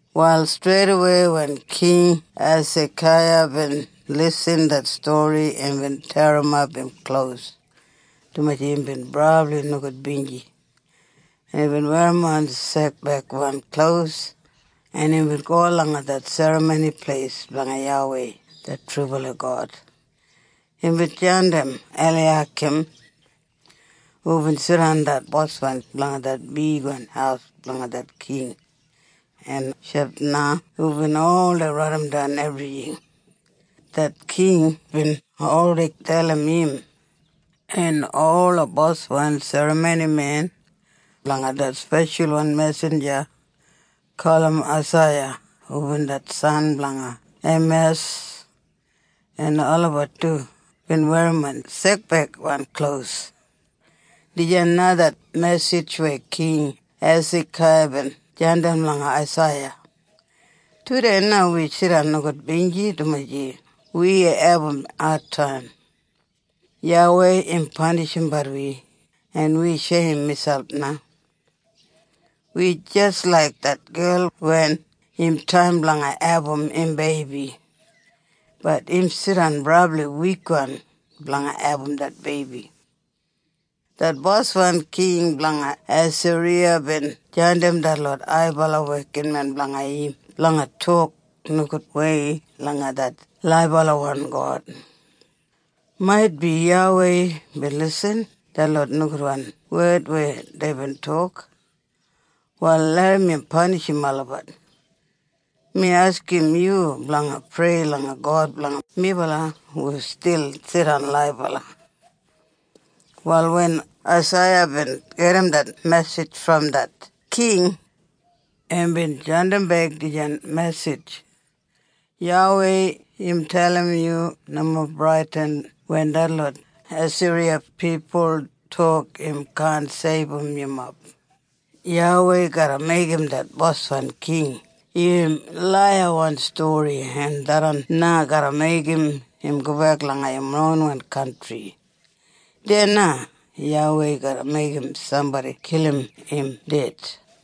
Wal streidawei wen King Hesakaiya bin lisin det stori imbin terrimap im klos dumaji imbin brabli nogudbinji en imbin werrimon sekbeigwan klos en imbin go langa det Serramoni Pleis blanga YAWEI det trubala God. Imbin jandim Eliyakim, hubin jidan det boswan blanga det bigwan haus blanga det king, en Shebna hubin oldei raidimdan ebrijing, det king bin oldei dalim im, en ola boswan serramonimen langa det speshalwan mesinja gulum Aisaiya hubin det san blanga Eimas. En olabat du bin werrimon sekbeigwan klos. Dijan na det mesij weya King Hesakaiya bin jandim langa Aisaiya, “Tudei na wi jidan nogudbinji dumaji wi abum adtaim. YAWEI im panishimbat wi en wi sheim miselp na. Wi jis laik det gel wen im taim blanga abum im beibi, bat im jidan brabli wikwan blanga abum det beibi. Det boswan king blanga Asiriya bin jandim detlot haibala wekinmen blanga im blanga tok nogudwei langa det laibalawan God. Maitbi YAWEI bin lisin detlot nogudwan wed weya deibin tok, wal larram im panishim olabat. Mi askim yu blanga prei langa God blanga melabat hu stil jidan laibala.” Wal wen Aisaiya bin gedim det mesij brom det king, imbin jandimbek dijan mesij, “YAWEI im dalim yu nomo bradin wen detlot Asiriya pipul tok im kaan seibum yumob. YAWEI garra meigim det boswan king irrim laiyawan stori en tharran na garra meigim im gobek langa im ronwan kantri. Deya na YAWEI garra meigim sambodi kilim im ded.”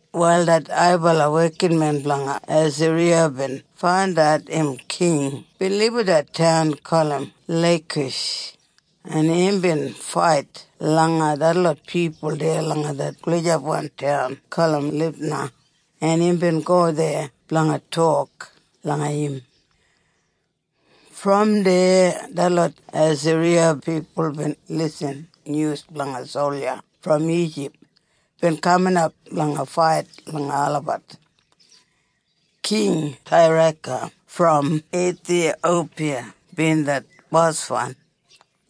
Wal det haibala wekinmen blanga Asiriya bin faindat im king bin libum det taun gulum Leikish en imbin fait langa detlot pipul deya langa det gulijapwan taun gulum Libna en imbin go deya blanga tok langa im. Brom deya detlot Asiriya pipul bin lisin nyus blanga solja brom Ijip bin kaminap blanga fait langa olabat. King Tairaka brom Ithiyopiya bin det boswan.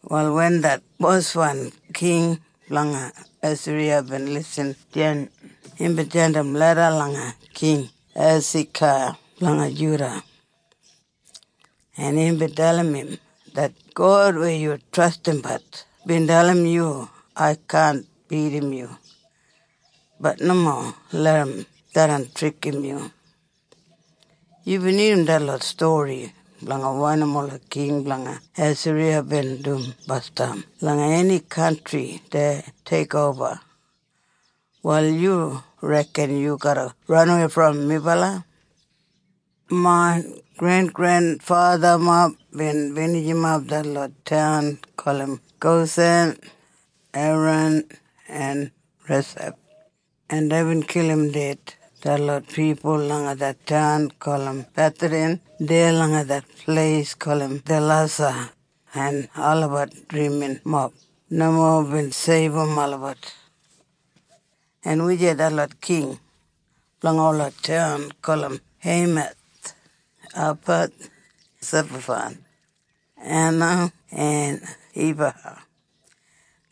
Wal wen det boswan king blanga Asiriya bin lisin dijan imbin jandim leda langa King Hesakaiya blanga Juda. En imbin dalim im, “Det God weya yu trastimbat bin dalim yu ai kaan bidim yu, bat nomo larram tharran trikim yu! Yubin irrim detlot stori blanga wanim ola king blanga Asiriya bin dum basdam langa eni kantri dei teikoba. Wal yu reken yu garra ranawei brom melabat? Main grengrenfathamob bin binijimap detlot taun gulum Gosan, Heran en Resef, en deibin kilim ded detlot pipul langa det taun gulum Betheden deya langa det pleis gulum Telasa, en olabat driminmob nomo bin seibum olabat. En wujei detlot king blanga ola taun gulum Heimath, Apad, Sefabaim, Hena en Ibaha?”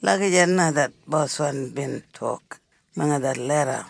Lagijat na det boswan bin tok langa det leda.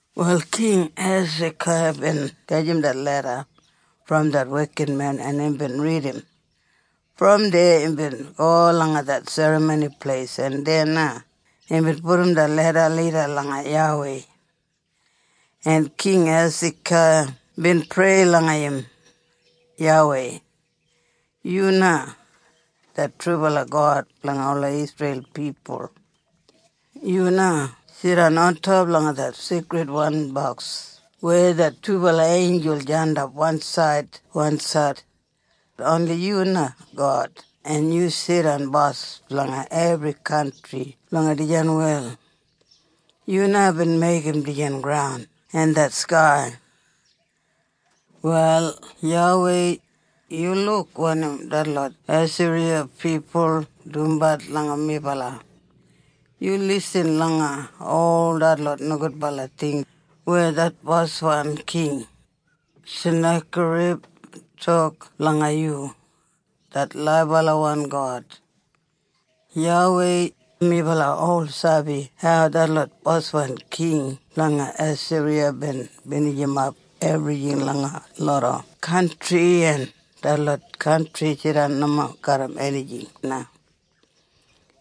Wal King Hesakaiya bin gajim det leda brom det wekinmen en imbin ridim. Brom deya imbin go langa det Serramoni Pleis en deya na imbin pudum det leda lida langa YAWEI. En King Hesakaiya bin prei langa im, “YAWEI, yu na det trubala God blanga ola Isreil pipul. Yu na jidan ontop langa det Seikridwan Boks weya det dubala einjul jandap wansaid wansaid. Oni yu na God en yu jidan bos blanga ebri kantri langa dijan wel. Yu na bin meigim dijan graun en det skai. Wal YAWEI, yu luk wanim detlot Asiriya pipul dumbat langa melabat. Yu lisin langa ol detlot nogudbala ting weya det boswan king, Senakerib, tok blanga yu, det laibalawan God. YAWEI, melabat ol sabi hau detlot boswan king blanga Asiriya bin binijimap ebrijing langa loda kantri en detlot kantri jidan nomo garram enijing na.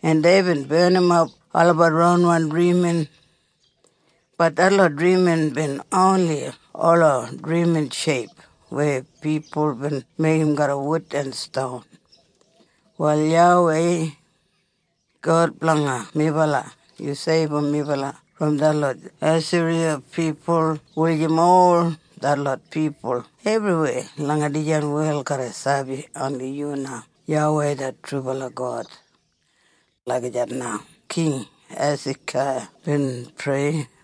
En deibin barnimap olabat ronwan drimin, bat detlot drimin bin oni ola drimin sheip weya pipul bin meigim garram wud en ston. Wal YAWEI, God blanga melabat, yu seibum melabat brom detlot Asiriya pipul wulijim ol detlot pipul ebriweya langa dijan wel garra sabi oni yu na YAWEI det trubala God.” Lagijat na King Hesakaiya bin prei.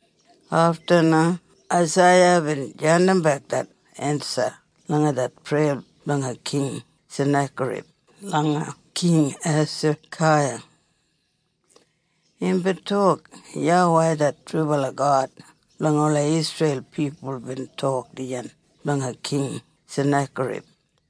Afta na Aisaiya bin jandimbek det ensa langa det preya blanga King Senakerib langa King Hesakaiya. Imbin tok, “YAWEI det trubala God blanga ola Isreil pipul bin tok dijan blanga King Senakerib.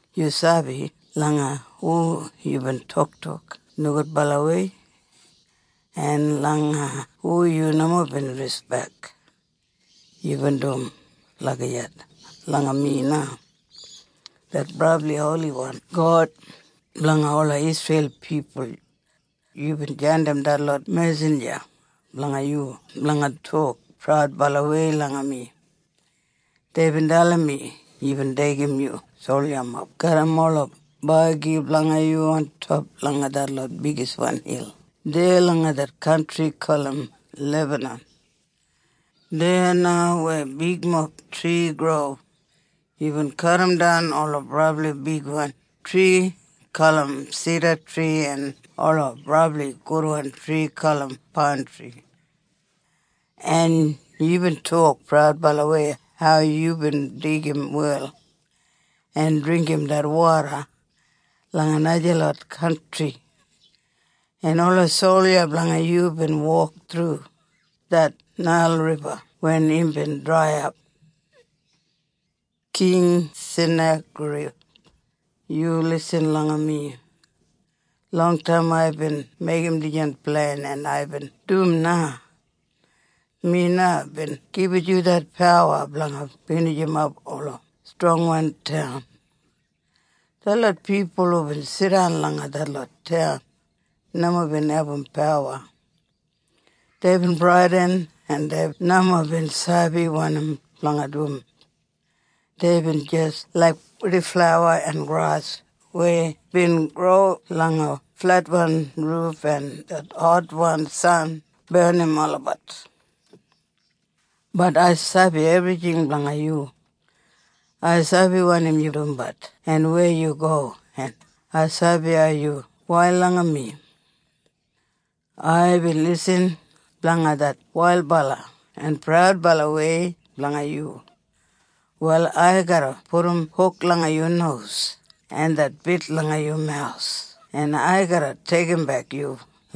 Yu sabi langa hu yubin toktok nogudbalawei? En langa hu yu nomo bin rispek? Yubin dum lagijat langa mi na, det brabli holiwan God blanga ola Isreil pipul. Yubin jandim detlot mesinja blanga yu blanga tok praudbalawei langa mi. Deibin dalim mi, yubin deigim yu soljamob garram ola bagi blanga yu ontop langa detlot bigiswan hil deya langa det kantri gulum Lebanon. Deya na weya bigmob tri gro yubin kadimdan ola brabli bigwan tri gulum sidatri en ola brabli gudwan tri gulum paintri. En yubin tok praudbalawei hau yubin digim wel en dringgim det woda langa najalot kantri, en ola solja blanga yu bin wok thru det Nail Riba wen imbin draiyap. “‘King Senakerib, yu lisin langa mi! Longtaim aibin meigim dijan plen en aibin dum na! Mi na bin gibit yu det pawa blanga binijimap ola strongwan taun. Detlot pipul hubin jidan langa detlot taun nomo bin abum pawa. Deibin bradin en dei nomo bin sabi wanim blanga dum. Deibin jis laik purdiflawa en gras weya bin gro langa fletwan ruf en det hotwan san barnim olabat. “‘Bat ai sabi ebrijing blanga yu. Ai sabi wanim yu dumbat en weya yu go en ai sabi hau yu wail langa mi. Aibin lisin blanga det wailbala en praudbalawei blanga yu. Wal ai garra pudum huk langa yu nos en det bit langa yu mawus en ai garra deigimbek yu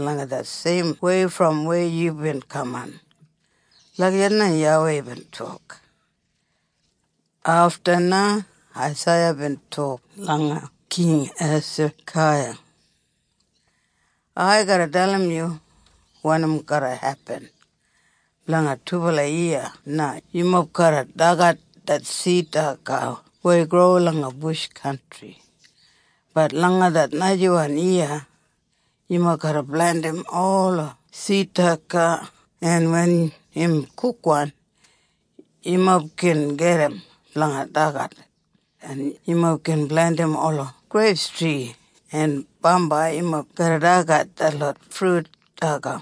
langa det seimwei brom weya yubin kaman.’” Lagijat na YAWEI bin tok. Afta na Aisaiya bin tok langa King Hesakaiya, “Ai garra dalim yu wanim garra hepin. Blanga dubala yiya na yumob garra dagat det sid daga weya gro langa bush kantri, bat langa det najawan yiya yumob garra plentim ola sid daga en wen im kukwan yumob gin gedim blanga dagat, en yumob gin plentim ola greiptri en bambai yumob garra dagat detlot frut daga.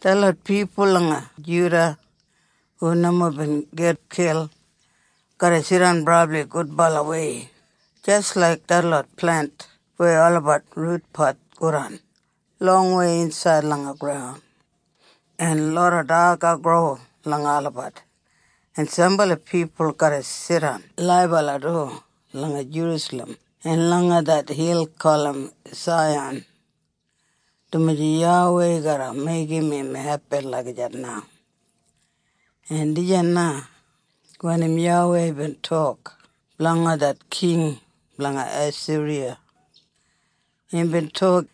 Detlot pipul langa Juda hu nomo bin gitkil garra jidan brabli gudbalawei jis laik detlot plent weya olabat rutpat godan longwei insaid langa graun en loda daga gro langa olabat. En sambala pipul garra jidan laibala du langa Jerusalem en langa det hil gulum Saiyan, dumaji YAWEI garra meigim im hepin lagijat na. “En dijan na wanim YAWEI bin tok blanga det king blanga Asiriya. Imbin tok,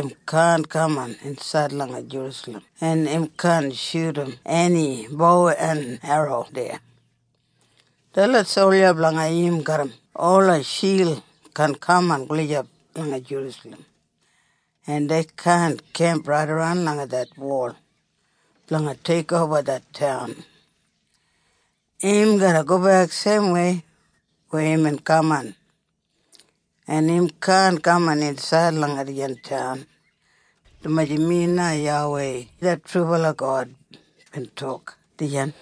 ‘Im kaan kaman insaid langa Jerusalem en im kaan shudum eni bo en erro deya. Detlot solja blanga im garram ola shild kaan kaman gulijap langa Jerusalem en dei kaan kemp raidaran langa det wol blanga teikoba det taun. Im garra gobek seimwei weya imbin kaman en im kaan kaman insaid langa dijan taun. Dumaji mi na YAWEI det trubala God bin tok dijan.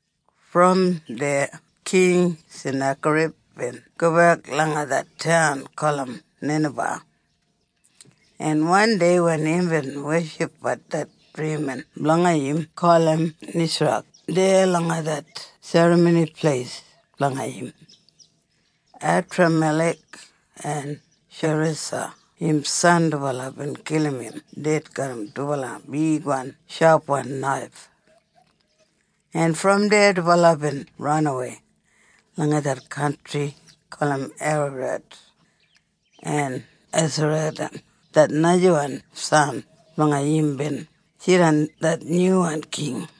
Brom deya King Senakerib bin gobek langa det taun gulum Ninaba. En wandei wen imbin weshipbat det drimin blanga im gulum Nisrak deya langa det serramoni pleis blanga im, Edramelek en Sharesa im san dubala bin kilim im ded garram dubala bigwan shapwan naif, en brom deya dubala bin ranawei langa det kantri gulum Eraret. En Esaradan det najawan san blanga im bin jidan det nyuwan king.